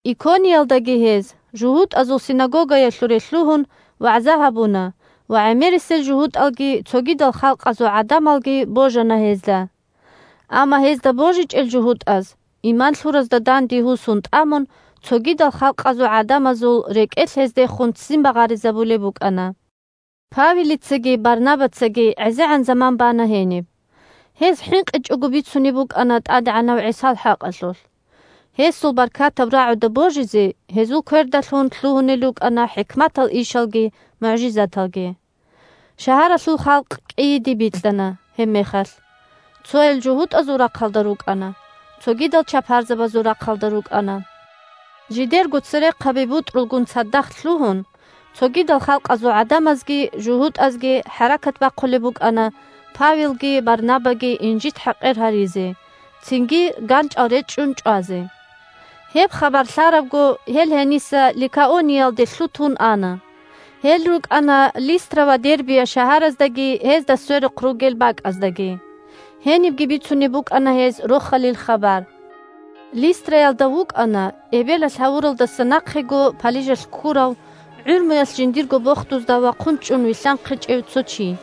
Икониялдаги гьез, жугьутӀазул синагогаялъуре лъугьун, вагӀза гьабуна, ва гӀемерисел жугьутӀалги цогидал халкъазул гӀадамалги божана гьезда. Амма гьезда божичӀел жугьутӀаз, иман лъуразда данде гьусун тӀамун, цогидал халкъазул гӀадамазул рекӀелъ гьездехун ццин багъаризабулеб букӀана. Павелицаги Барнабацаги гӀезегӀан заман бана гьениб. Гьез хӀинкъичӀого бицунеб букӀана ТӀадегӀанав ГӀисал хӀакъалъулъ. Гьесул баркатаб рагӀуда божизе гьезул квердалъун лъугьунел рукӀана хӀикматал ишалги мугӀжизаталги. Шагьаралъул халкъ кӀийиде бикьана гьебмехалъ: цоял жугьутӀазул рахъалда рукӀана, цогидал чапарзабазул рахъалда рукӀана. Жидерго церехъаби-бутӀрулгун цадахъ лъугьун, цогидал халкъазул гӀадамазги жугьутӀазги хӀаракат бахъулеб букӀана Павелги Барнабаги инжит-хӀакъир гьаризе, цинги ганчӀал речӀчӀун чӀвазе. Гьеб хабар лъарабго, гьел гьениса Ликаониялде лъутун ана. Гьел рукӀана Листра ва Дербия шагьараздаги гьезда сверухъ ругел бакӀаздаги. Гьенибги бицунеб букӀана гьез Рохалил хабар. Листраялда вукӀана эбелалъ гьавуралдаса нахъего палижалъ ккурав, гӀумруялъ жиндирго бохдузда вахъун чӀун вилълъанхъичӀев цо чи.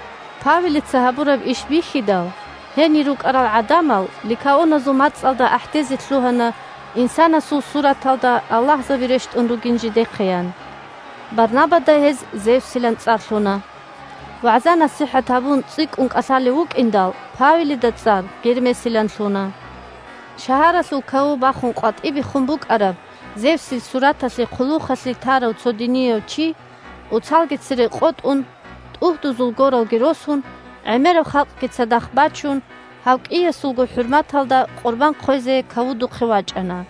Павелица гьабураб иш бихьидал, гьенир рукӀарал гӀадамал ликаоназул мацӀалда ахӀдезе лъугьана инсанасул сураталда аллагьзаби рещтӀун ругин жидехъеян. Барнабада гьез Зевсилан цӀар лъуна. ВагӀза-насихӀат гьабун цӀикӀкӀун кӀалъалев вукӀиндал, Павелида цӀар Гермесилан лъуна. Шагьаралъул каву бахун къватӀибехун букӀараб Зевсил сураталъе хъулухъалъе тарав цо динияв чи, оцалги цере къотӀун, тӀугьдузул горалги росун, гӀемераб халкъги цадахъ бачун, гьав кӀиясулго хӀурматалда къурбан хъвезе кавудухъе вачӀана.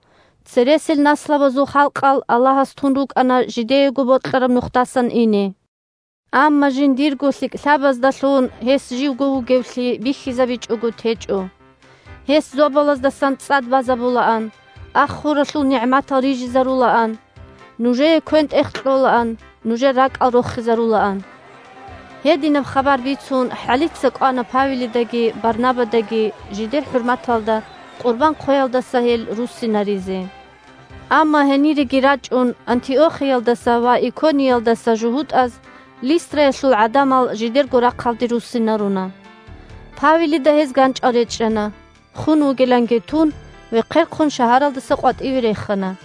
Цересел наслабазул халкъал Аллагьас тун рукӀана жидеего бокьараб нухдасан ине. Амма жиндирго лъикӀлъабаздалъун Гьес живго вугевлъи бихьизабичӀого течӀо. Гьес зобалаздасан цӀад базабулаан, ах-хуралъул нигӀматал рижизарулаан. Нужее квен-тӀех кьолаан, нужер ракӀал рохизарулаан. Гьединаб хабар бицун хӀалицаго кӀвана Павелидаги Барнабадаги жидер хӀурматалда къурбан хъвеялдаса гьел руссинаризе. Амма гьениреги рачӀун Антиохиялдаса ва Икониялдаса жугьутӀаз Листраялъул гӀадамал жидерго рахъалде руссинаруна. Павелида гьез ганчӀал речӀчӀана, хун вугиланги тун, вехъерхъун шагьаралдаса къватӀиве рехана.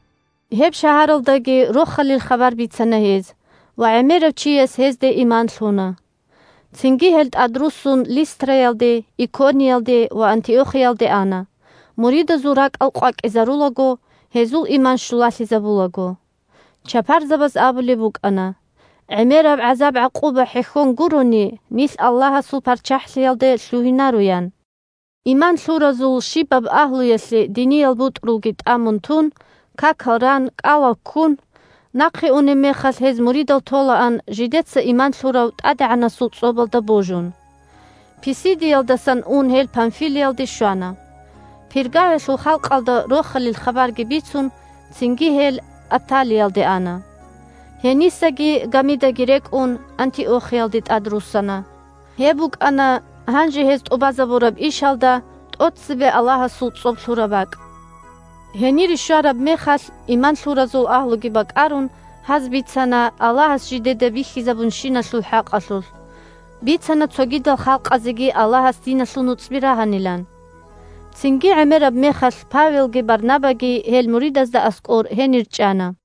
Гьеб шагьаралдаги Рохалил хабар бицана гьез ва гӀемерав чияс гьезде иман лъуна. Цинги гьел тӀадруссун Листраялде, Икониялде ва Антиохиялде ана, муридазул ракӀал къвакӀизарулаго, гьезул иман щулалъизабулаго. Чапарзабаз абулеб букӀана: – ГӀемераб гӀазаб-гӀакъуба хӀехьон гурони нилъ Аллагьасул ПарччахӀлъиялде лъугьинаро, – ян. Иман лъуразул щибаб агьлуялъе диниял бутӀрулги тӀамун тун, какал ран, кӀалал ккун, нахъе унеб мехалъ гьез муридал толаан жидеца иман лъурав ТӀадегӀанасул цӀобалда божун. Писидиялдасан ун гьел Памфилиялде щвана. Пергаялъул халкъалда Рохалил хабарги бицун, цинги гьел Атталиялде ана. Гьенисаги, гамидаги рекӀун, Антиохиялде тӀадруссана. Гьеб букӀана гьанже гьез тӀубазабураб ишалда тӀоцебе Аллагьасул цӀоб лъураб бакӀ. Гьенире щвараб мехалъ, иман лъуразул агьлуги бакӀарун, гьаз бицана Аллагьас жидеда бихьизабунщиналъул хӀакъалъулъ, бицана цогидал халкъазеги Аллагьас диналъул нуцӀби рагьанилан. Цинги гӀемераб мехалъ Павелги Барнабаги гьел муридазда аскӀор гьенир чӀана.